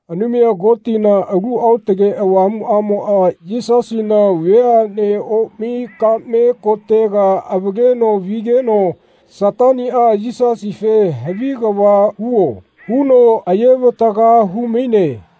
Anumaya Kotina Alu Aotake Avamuꞌamoꞌa Yisasina veaꞌne omai kaꞌme kotega avaleno vigeno Sataniꞌa Yisasife “Havi kava huo.” huno aye-vataga hu-maine.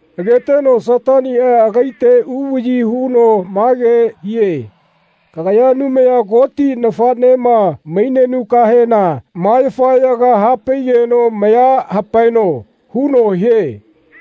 Agategeno Sataniꞌa agaite uvaꞌyi huno mage hie “Kagaya Anumaya Koti nafaꞌnema mainenukahena ma yafaꞌyaga hapaigeno maya hapaeno.” huno hie.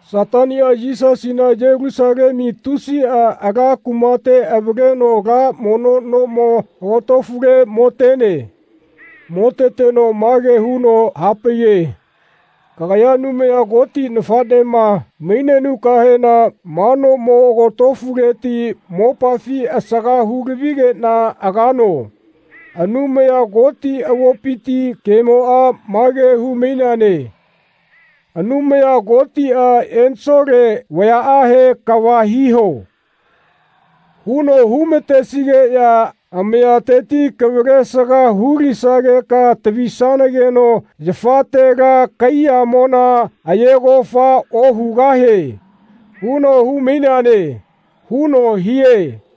Sataniꞌa Yisasina Yelusalemu tusiꞌa ala kumate avaleno ala mono nomo agotofule motene. Moteteno mage huno hapaiye “Kagaya Anumaya Koti nafaꞌnema mainenukahena ma nomo agotofuleti mopafi asaga hulavigeꞌna agano. Anumaya Koti avopiti kemoꞌa mage hu-maineane ‘Anumaya Kotiꞌa ensole vayaꞌahe ‘Kava hiho.’ huno hu-ma-tesigeꞌya amayateti kavalesaga hu-lisageka tavisanageno yafatela kaiyamona aye kofa ohugahieꞌ huno hu-maineane.” huno hie.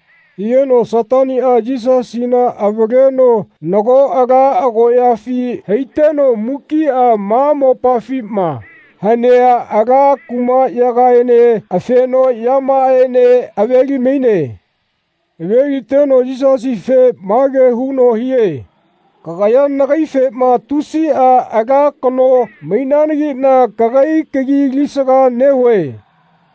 Higeno Sataniꞌa Yisasina avaleno nago ala agoꞌyafi haiteno mukiꞌa ma mopafima hanea ala kumaꞌyagaene afenoꞌyamaꞌaene ave-li-maine. Aveliteno Yisasife mage huno hie “Kagaya nagaifema ‘Tusiꞌa ala kano mainananagiꞌna kagai kagi alisaga nehue.’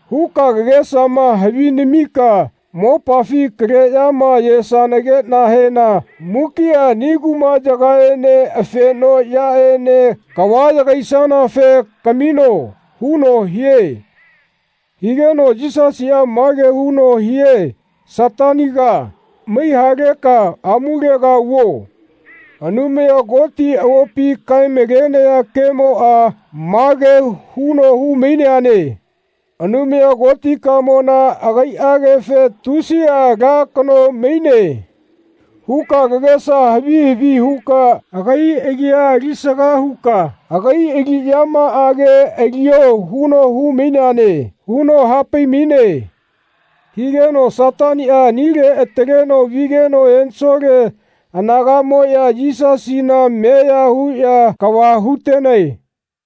huka kagesama havi namika mopafi kaleꞌyama ayesanageꞌnahena mukiꞌa ani kumaꞌyagaene afenoꞌyaꞌene kava yagaisanafe kamino.” huno hie. Higeno Yisasiꞌa mage huno hie Sataniga mai haleka amulega vuo. Anumaya Koti avopi kae-malenaya kemoꞌa mage huno hu-maineane “Anumaya Kotikamona akaiꞌagefe ‘Tusiꞌa ala kano maine.’ huka kagesa havi havi huka agai agia alisaga huka agai aliꞌyamaꞌage alio huno hu-maineane.” huno hapai-maine. Higeno Sataniꞌa anile ataleno vigeno ensole anagaꞌmoꞌya Yisasina meya huꞌya kava hu-tenae.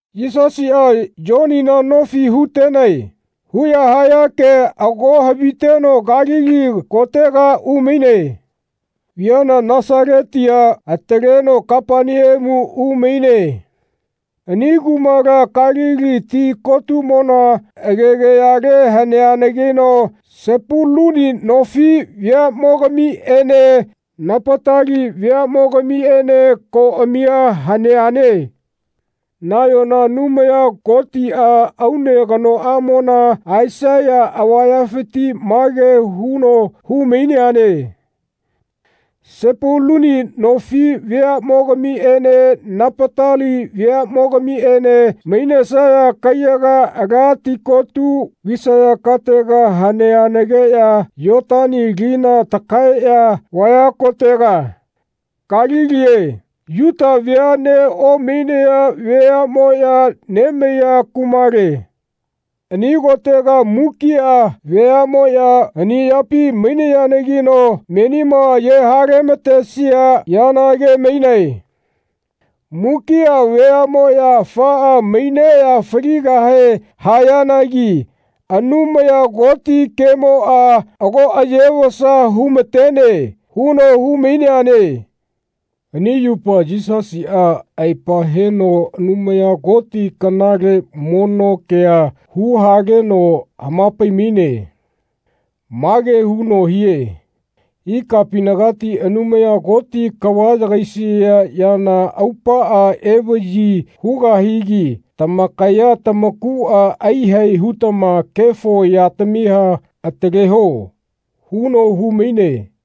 Yisasiꞌa “Yonina nofi hu-tenae.” huꞌya haya kea ago haviteno Kalili kotega umaine. Viana Nasaletia ataleno Kapaneamu umaine. Ani kumala Kalili ti kotumona agegayale haneanagino Sepuluni nofi veaꞌmogamiꞌene Napatali veaꞌmogamiꞌene koꞌamiꞌa haneane. Nayona Anumaya Kotiꞌa aune kanoꞌamona, Aisaya avayafiti mage huno hu-maineane “Sepuluni nofi veaꞌmogamiꞌene Napatali veaꞌmogamiꞌene mainesaya kaiyaga ala tikotu visaya katega haneanagiꞌya Yotani lina takaeꞌya vaaya kotega, Kalilie, Yuta veaꞌne omainaya veaꞌmoꞌya nemaiya kumale. Ani kotega mukiꞌa veamoꞌya hani yapi mainayanagino menima aye-hale-matesia yana age-mainae. Mukiꞌa veaꞌmoꞌya afaꞌa maineꞌya faligahe hayanagi Anumaya Koti kemoꞌa ago aye-vasa hu-matene.” huno hu-maineane. Ani yupa Yisasiꞌa aepa heno Anumaya Koti kanale mono kea hu-haleno hama-pai-maine. Mage huno hie “Ikapinagati Anumaya Koti kava yagaisia yana aupaꞌa evaꞌyi hugahigi tamakaya tamakuꞌa aiyahae hutama kefo yatamia ataleho.” huno hu-maine.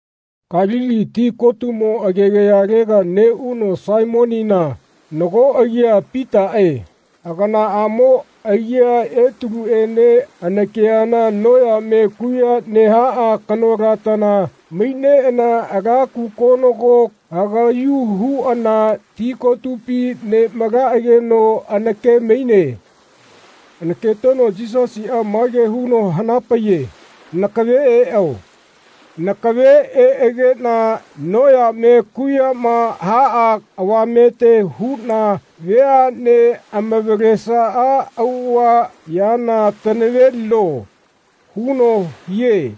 Kalili ti kotumo agegayalega neꞌuno Saimonina, nago agia Pitaꞌe, aganaꞌamo agia Etaluene anakeana noyame kuꞌya nehaꞌa kanolatana maineꞌana ala kukonogo hagaꞌyu huꞌana ti kotupi nemalaꞌageno anake-maine. Anaketeno Yisasiꞌa mage huno hana-paiye “Nakave eꞌo. Nakave eꞌageꞌna noyame kuꞌyama haꞌa avamete huꞌna veaꞌne amavalesaꞌa auꞌava yana tanavelino.” huno hie.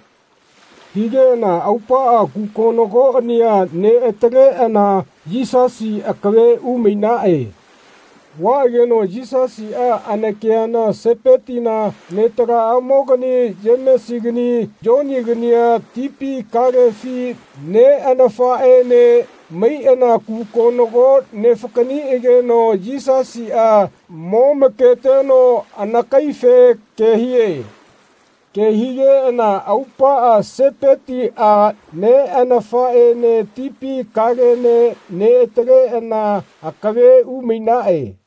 Higeꞌana aupaꞌa kukonogoꞌania neꞌataleꞌana Yisasi akave umainaꞌe. Vaꞌageno Yisasiꞌa anakeana Sepetina netalamaꞌamoꞌagani Yemesigani Yonigania tipi kalefi neꞌanafaꞌene maiꞌana kukonogo nefakaꞌniꞌageno Yisasiꞌa momaketeno anakaife ke hie. Ke higeꞌana aupaꞌa Sepetiꞌa neꞌanafaꞌene tipi kalene neꞌataleꞌana akave umainaꞌe.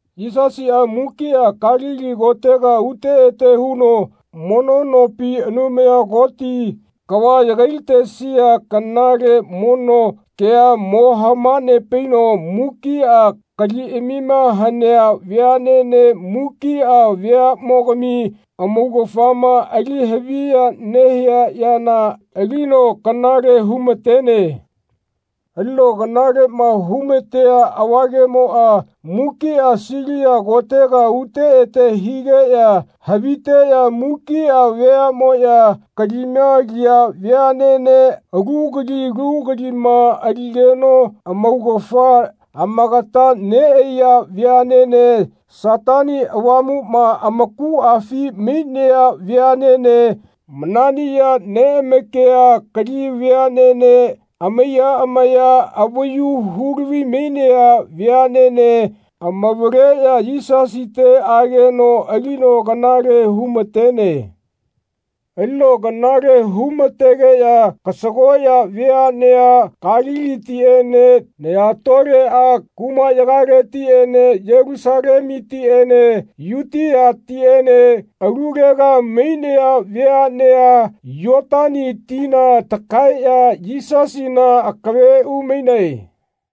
Yisasiꞌa mukiꞌa Kalili kotega ute ete huno mono nopi Anumaya Koti kava yagai-latesia kanale mono kea mo hama-nepaino mukiꞌa kaliꞌamima hanea veaꞌnene mukiꞌa veaꞌmogami amaugafama ali haviya nehia yana alino kanale hu-ma-tene. Alino kanaleꞌma hu-ma-tea avagemoꞌa mukiꞌa Silia kotega ute ete higeꞌya haviteꞌya mukiꞌa veaꞌmoꞌya kalima aliya veaꞌnene alu kali alu kalima aligeno amaugafa amakata neꞌaiya veaꞌnene Satani Avamuꞌma amakuꞌafi mainea veaꞌnene mananiꞌya neꞌamakia kali veaꞌnene amaiya amaya avayu hu-lavi-mainea veaꞌnene amavaleꞌya Yisasite ageno alino kanale hu-ma-tene. Alino kanale hu-ma-tegeꞌya kasagoꞌya veaꞌnea Kalilitiꞌene naya-toleꞌa kumaꞌyagaletiꞌene Yelusalemutiꞌene Yutiatiꞌene alulega mainaya veaꞌnea Yotani tina takaeꞌya Yisasina akave umainae.